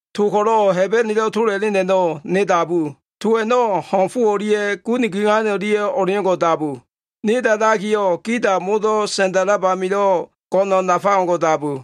To ko꞉lo꞉ Hebenelo꞉ tola꞉len a꞉no꞉ ne dabu. To a꞉no꞉ ho꞉n fo o꞉lia꞉ gun guiyan o꞉lia꞉ o꞉leo꞉ngo꞉ dabu. Ne da꞉dakiyo꞉, gida modo꞉ sa꞉nda꞉lab amilo꞉ go꞉no꞉ nafa o꞉ngo꞉ dabu.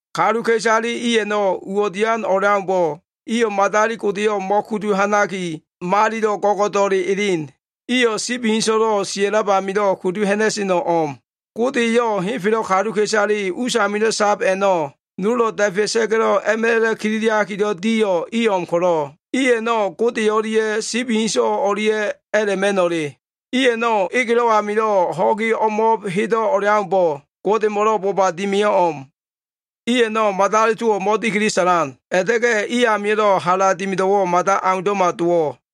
Kaluka꞉isale i a꞉no꞉ uwo꞉ dian o꞉leaumbo꞉, madali godeyo꞉ mo꞉kudu ha꞉naki, malilo꞉ go꞉go꞉do꞉le elen. Iyo꞉ sibi inso꞉lo꞉ sia꞉lab amilo꞉, kudu ha꞉na꞉seno꞉ o꞉m. Gode eyo꞉ henfelo꞉ kaluka꞉isale usamilo꞉ sab a꞉no꞉ nolo꞉ da꞉fea꞉sa꞉ga꞉lo꞉ a꞉ma꞉la꞉ kililiakilo꞉ diyo꞉ i o꞉m ko꞉lo꞉, i a꞉no꞉ Gode o꞉lia꞉ sibi inso꞉ o꞉lia꞉ a꞉la꞉ma꞉no꞉le. I a꞉no꞉, egelo꞉ amilo꞉ ho꞉gi hedo꞉ o꞉leaumbo꞉ Godemo꞉lo꞉ boba dimiyo꞉ o꞉m. I a꞉no꞉ madali towo꞉ mo꞉dikili sa꞉lan, a꞉la꞉ta꞉ga꞉ i amio꞉lo꞉ hala dimido꞉wo꞉ mada aundo꞉mo꞉ dowo꞉.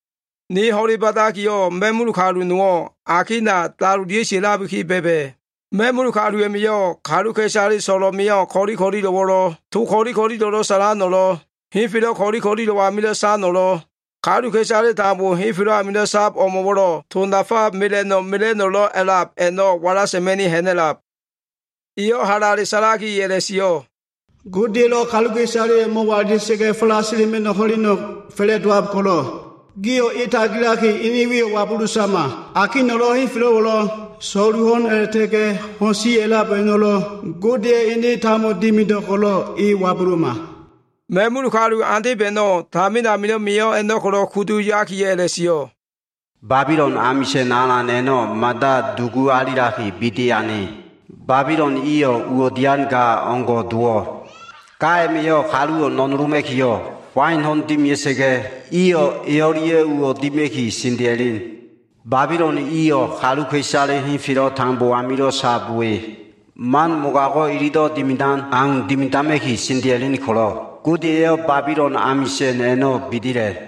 Ne ho꞉le ba꞉dakiyo꞉, ma꞉mul kalu nowo꞉ akina dalolia꞉ga꞉ sia꞉labiki ba꞉ba꞉. Ma꞉mul kalu a꞉ma꞉yo꞉ kaluka꞉isale so꞉lo꞉ mio꞉ ko꞉li ko꞉lilo꞉wo꞉lo꞉, to ko꞉li ko꞉lilo꞉lo꞉ sa꞉lano꞉lo꞉, henfelo꞉ ko꞉li ko꞉lilo꞉ amilo꞉ sano꞉lo꞉, kaluka꞉isale tambo henfelo꞉ amilo꞉ sab o꞉mo꞉wo꞉lo꞉ to nafa mela꞉no꞉ mela꞉no꞉lo꞉ a꞉lab a꞉no꞉ wala sa꞉ma꞉ni ha꞉na꞉lab. Eyo꞉ halale sa꞉laki a꞉la꞉sio꞉, “Godeya꞉lo꞉ kaluka꞉isaleyo꞉ mo꞉walila꞉sa꞉ga꞉ falasila꞉ma꞉no꞉ ho꞉leno꞉ fa꞉la꞉dowab ko꞉lo꞉, gio꞉ e tagilaki, ene wiyo꞉ wabulu sama. Akino꞉lo꞉ henfelo꞉wo꞉lo꞉ so꞉lu ho꞉no꞉ a꞉la꞉ta꞉ga꞉ ho꞉n si a꞉lab a꞉no꞉lo꞉ Godeya꞉ ene tambo dimido꞉ ko꞉lo꞉ e wabuluma.” Ma꞉mul kalu andeb a꞉no꞉ tamin amilo꞉ mio꞉ a꞉no꞉ ko꞉lo꞉ kudu yakiyo꞉ a꞉la꞉sio꞉, “Babilon amisa꞉n alan a꞉no꞉ mada dugu alilaki, bidi ane. Babilon iyo꞉ uwo꞉ dian ga o꞉ngo꞉ dowo꞉. Ga a꞉ma꞉yo꞉ kaluwo꞉ no꞉noloma꞉kiyo꞉ wain ho꞉no꞉ dimia꞉sa꞉ga꞉, iyo꞉ e o꞉lia꞉ uwo꞉ dima꞉ki sendea꞉len. Babilon iliyo꞉ kaluka꞉isale henfelo꞉ tambo amilo꞉ sab we, man mogago꞉ ililo꞉ dimidan a꞉no꞉ ko꞉lo꞉ dimidama꞉ki sendea꞉len ko꞉lo꞉, Gode eyo꞉ Babilon amisa꞉n a꞉no꞉ bidila꞉.”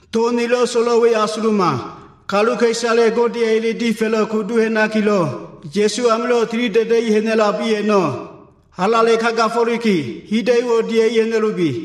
To nilo꞉ so꞉lo꞉l we asuluma. Kaluka꞉isale Godeya꞉ ele difa꞉lo꞉ kudu ha꞉nakilo꞉, Ya꞉su amilo꞉ tilida꞉da꞉i ha꞉na꞉lab i a꞉no꞉, halale kagafo꞉liki, hida꞉yo꞉wo꞉ dia꞉li ha꞉na꞉lubi.”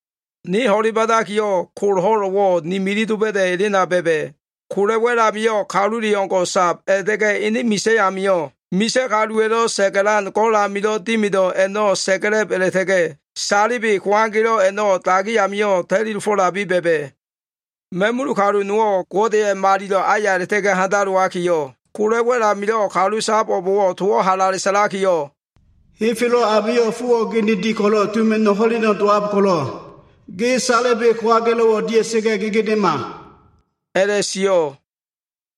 Ne ho꞉le ba꞉dakiyo꞉, kol ho꞉lo꞉wo꞉ ni milif doba꞉da꞉ elena ba꞉ba꞉. Kola꞉ wa꞉l amio꞉ kalule o꞉ngo꞉ sab, a꞉la꞉ta꞉ga꞉ ene misa꞉ amio꞉ misa꞉ kaluwa꞉lo꞉ sa꞉ga꞉lan go꞉l amilo꞉ dimido꞉ a꞉no꞉ sa꞉ga꞉la꞉b a꞉la꞉ta꞉ga꞉, salebe kowagelo꞉ a꞉no꞉ dagi amio꞉ ta꞉li dofo꞉labi ba꞉ba꞉. Ma꞉mul kalu nowo꞉ Godeya꞉ malilo꞉ aya a꞉la꞉ta꞉ga꞉ handalowakiyo꞉, kola꞉ wa꞉l amilo꞉ kalu sab o꞉mo꞉wo꞉ towo꞉ halale sa꞉lakiyo꞉, “Henfelo꞉ amilo꞉ fowo꞉ geneli ko꞉lo꞉ tuma꞉no꞉ ho꞉leno꞉ dowab ko꞉lo꞉, ge salebe kowagelo꞉wo꞉ dia꞉sa꞉ga꞉ gegedema” a꞉la꞉sio꞉.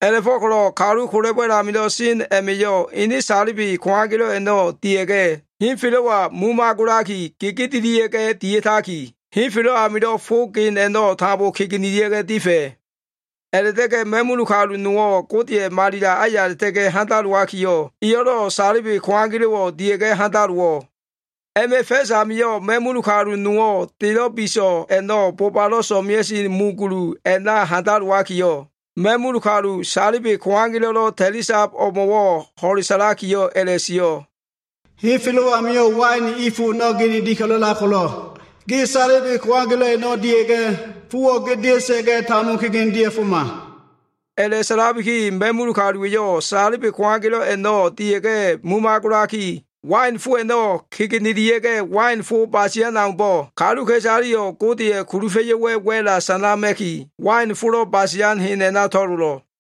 A꞉la꞉fo꞉ko꞉lo꞉ kalu kola꞉ wa꞉l amilo꞉ sen a꞉ma꞉yo꞉ ene salebe kowagelo꞉ a꞉no꞉ dia꞉sa꞉ga꞉, henfelo꞉wa mumagolaki gegedelia꞉ga꞉ dia꞉taki, henfelo꞉ amilo꞉ fo gen a꞉no꞉ tambo kegenelia꞉ga꞉ difa꞉. A꞉la꞉ta꞉ga꞉ ma꞉mul kalu nowo꞉ Godeya꞉ malilo꞉ aya a꞉la꞉ta꞉ga꞉ handalowakiyo꞉, eyo꞉lo꞉ salebe kowagelo꞉wo꞉ dia꞉ga꞉ handalowo꞉. A꞉ma꞉ fa꞉s amio꞉, ma꞉mul kalu nowo꞉ delo꞉ biso꞉ a꞉no꞉ bobalo꞉ so꞉mea꞉sen mu gululo꞉ a꞉na handalowakiyo꞉, ma꞉mul kalu, salebe kowagelo꞉lo꞉ ta꞉li sab o꞉mo꞉wo꞉ ho꞉le sa꞉lakiyo꞉ a꞉la꞉sio꞉. “Henfelo꞉ amio꞉ wain i fo a꞉no꞉ geneli a꞉lab ko꞉lo꞉, ge salebe kowagelo꞉ a꞉no꞉ dia꞉ga꞉, fowo꞉ gedea꞉sa꞉ga꞉ tambo kegene dia꞉foma.” A꞉la꞉sa꞉labiki, ma꞉mul kaluwa꞉yo꞉ salebe kowagelo꞉ a꞉no꞉ dia꞉ga꞉ mumagolaki, wain fo a꞉no꞉ kegenelia꞉ga꞉, wain fo basian aumbo꞉, kaluka꞉isaleyo꞉ Godeya꞉ kulufa꞉yo꞉wa꞉ wa꞉la꞉ sanama꞉ki, wain folo꞉ basian hen a꞉na to꞉lolo꞉.